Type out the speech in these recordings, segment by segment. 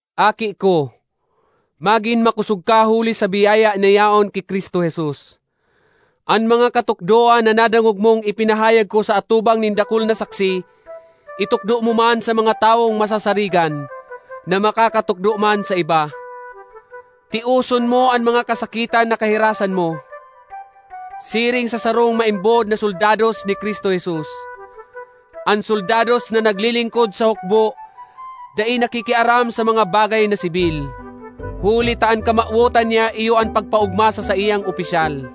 Aki ko, magin makosog ka huli sa biyaya na yaon ki Cristo Jesus. An mga katukdoan na nadangog mong ipinahayag ko sa atubang nin dakul na saksi, itukdo mo man sa mga tawong masasarigan, na makakatukdo man sa iba. Tioson mo an mga kasakitan na kahirasan mo, siring sa sarong maimbod na soldados ni Cristo Jesus. An soldados na naglilingkod sa hukbo dai nakikiaram sa mga bagay na sibil, huli ta an kamawotan niya iyo an pagpaogma sa saiyang opisyal.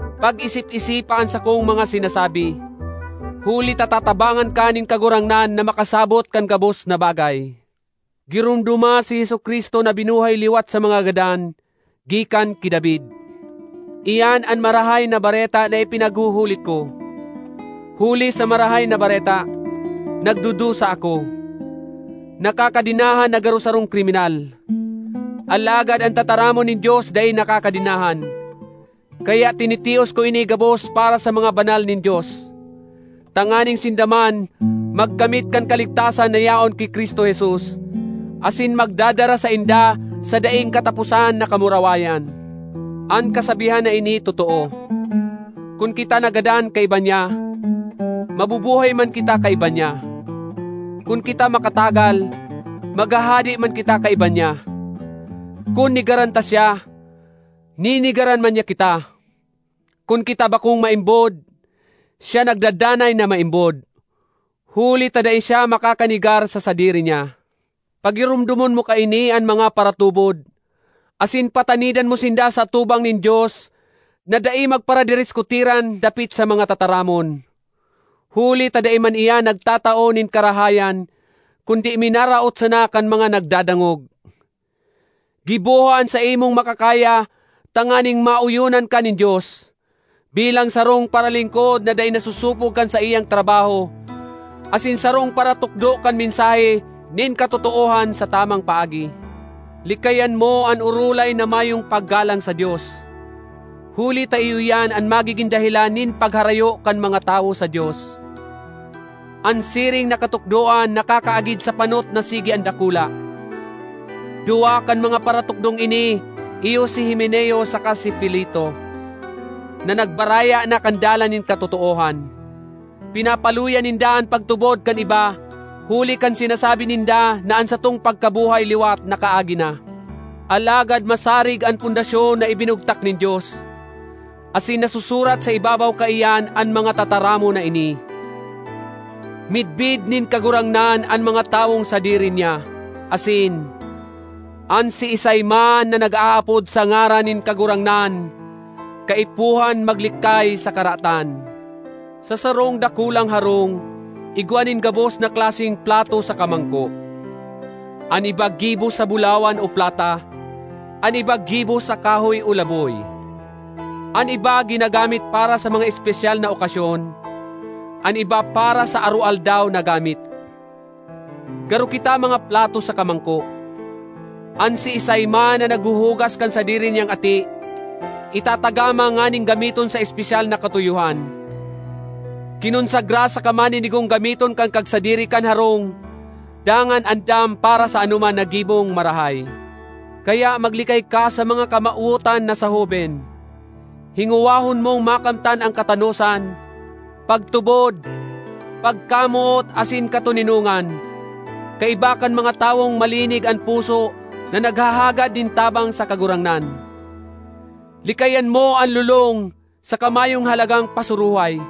Pag-isip-isipa an sakong mga sinasabi, huli ta tatabangan ka nin Kagurangnan na makasabot kan gabos na bagay. Giromdoma si Jesu-Cristo na binuhay liwat sa mga gadan, gikan ki David. Iyan an Marahay na Bareta na ipinaghuhulit ko. Huli sa Marahay na Bareta, nagdudusa ako; nakakadenahan na garo sarong kriminal. Alagad an tataramon nin Dios dai nakakadenahan, kaya tinitios ko ini gabos para sa mga banal nin Dios, tanganing sinda man magkamit kan kaligtasan na yaon ki Cristo Jesus, asin magdadara sainda sa daing kataposan na kamurawayan. An kasabihan na ini totoo: “Kun kita nagadan kaiba niya, mabubuhay man kita kaiba niya; kun kita makatagal, maghahade man kita kaiba niya; kun negaran ta siya, nenegaran man niya kita; kun kita bakong maimbod, siya nagdadanay na maimbod, huli ta dai siya makakanegar sa sadiri niya.” Pagiromdomon mo kaini an mga paratubod asin patanidan mo sinda sa atubang nin Dios na dai magparadiriskutiran dapit sa mga tataramon, huli ta dai man iyan nagtatao nin karahayan, kundi minaraot sana kan mga nagdadangog. Giboha an saimong makakaya tanganing maoyonan ka nin Dios, bilang sarong paralingkod na dai nasosopog kan saiyang trabaho, asin sarong paratukdo kan mensahe nin katotoohan sa tamang paagi. Likayan mo an orolay na mayong paggalang sa Dios, huli ta iyo iyan an magigin dahelan nin pagharayo kan mga tawo sa Dios. An siring na katukdoan nakakaagid sa panot na sige an dakula. Duwa kan mga paratukdong ini iyo si Himeneo saka si Fileto, na nagbaraya na kan dalan nin katotoohan. Pinapaluya ninda an pagtubod kan iba huli kan sinasabi ninda na an satong pagkabuhay liwat nakaagi na. Alagad masarig an pundasyon na ibinugtak nin Dios, asin nasusurat sa ibabaw kaiyan an mga tataramon na ini: “Midbid nin Kagurangnan an mga tawong sadiri niya” asin, “An siisay man na nag-aapod sa ngaran nin Kagurangnan kaipuhan maglikay sa karatan.” Sa sarong dakulang harong igwa nin gabos na klaseng plato saka mangko. An iba gibo sa bulawan o plata, an iba gibo sa kahoy o laboy. An iba ginagamit para sa mga espesyal na okasyon, an iba para sa aroaldaw na gamit. Garo kita mga plato saka mangko. An siisay man na naghuhugas kan sadiri niyang ati, itatagama nganing gamiton sa espesyal na katuyohan, kinonsagra saka maninigong gamiton kan kagsadiri kan harong dangan andam para sa anoman na gibong marahay. Kaya maglikay ka sa mga kamawotan na sa hoben. Hingowahon mong makamtan an katanosan, pagtubod, pagkamoot, asin katoninongan, kaiba kan mga tawong malinig an puso na naghahagad nin tabang sa Kagurangnan. Likayan mo an lolong saka mayong halagang pasuruhay;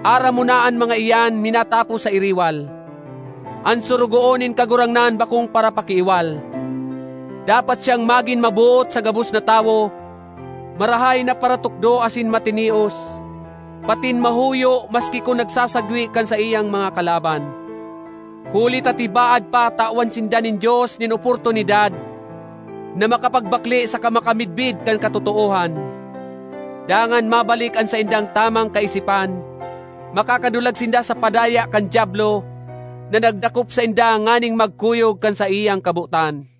aram mo na an mga iyan minatapos sa iriwal. An sorogoon nin Kagurangnan bakong parapakiiwal. Dapat siyang magin maboot sa gabos na tawo, marahay na paratukdo asin matinios, patin mahuyo maski kun nagsasagwe kan saiyang mga kalaban, huli ta tibaad pa tawan sinda nin Dios nin oportunidad na makapagbakle saka makamidbid kan katotoohan. Dangan mabalik an saindang tamang kaisipan; makakadulag sinda sa padaya kan Diablo, na nagdakop sainda nganing magkuyog kan saiyang kabotan.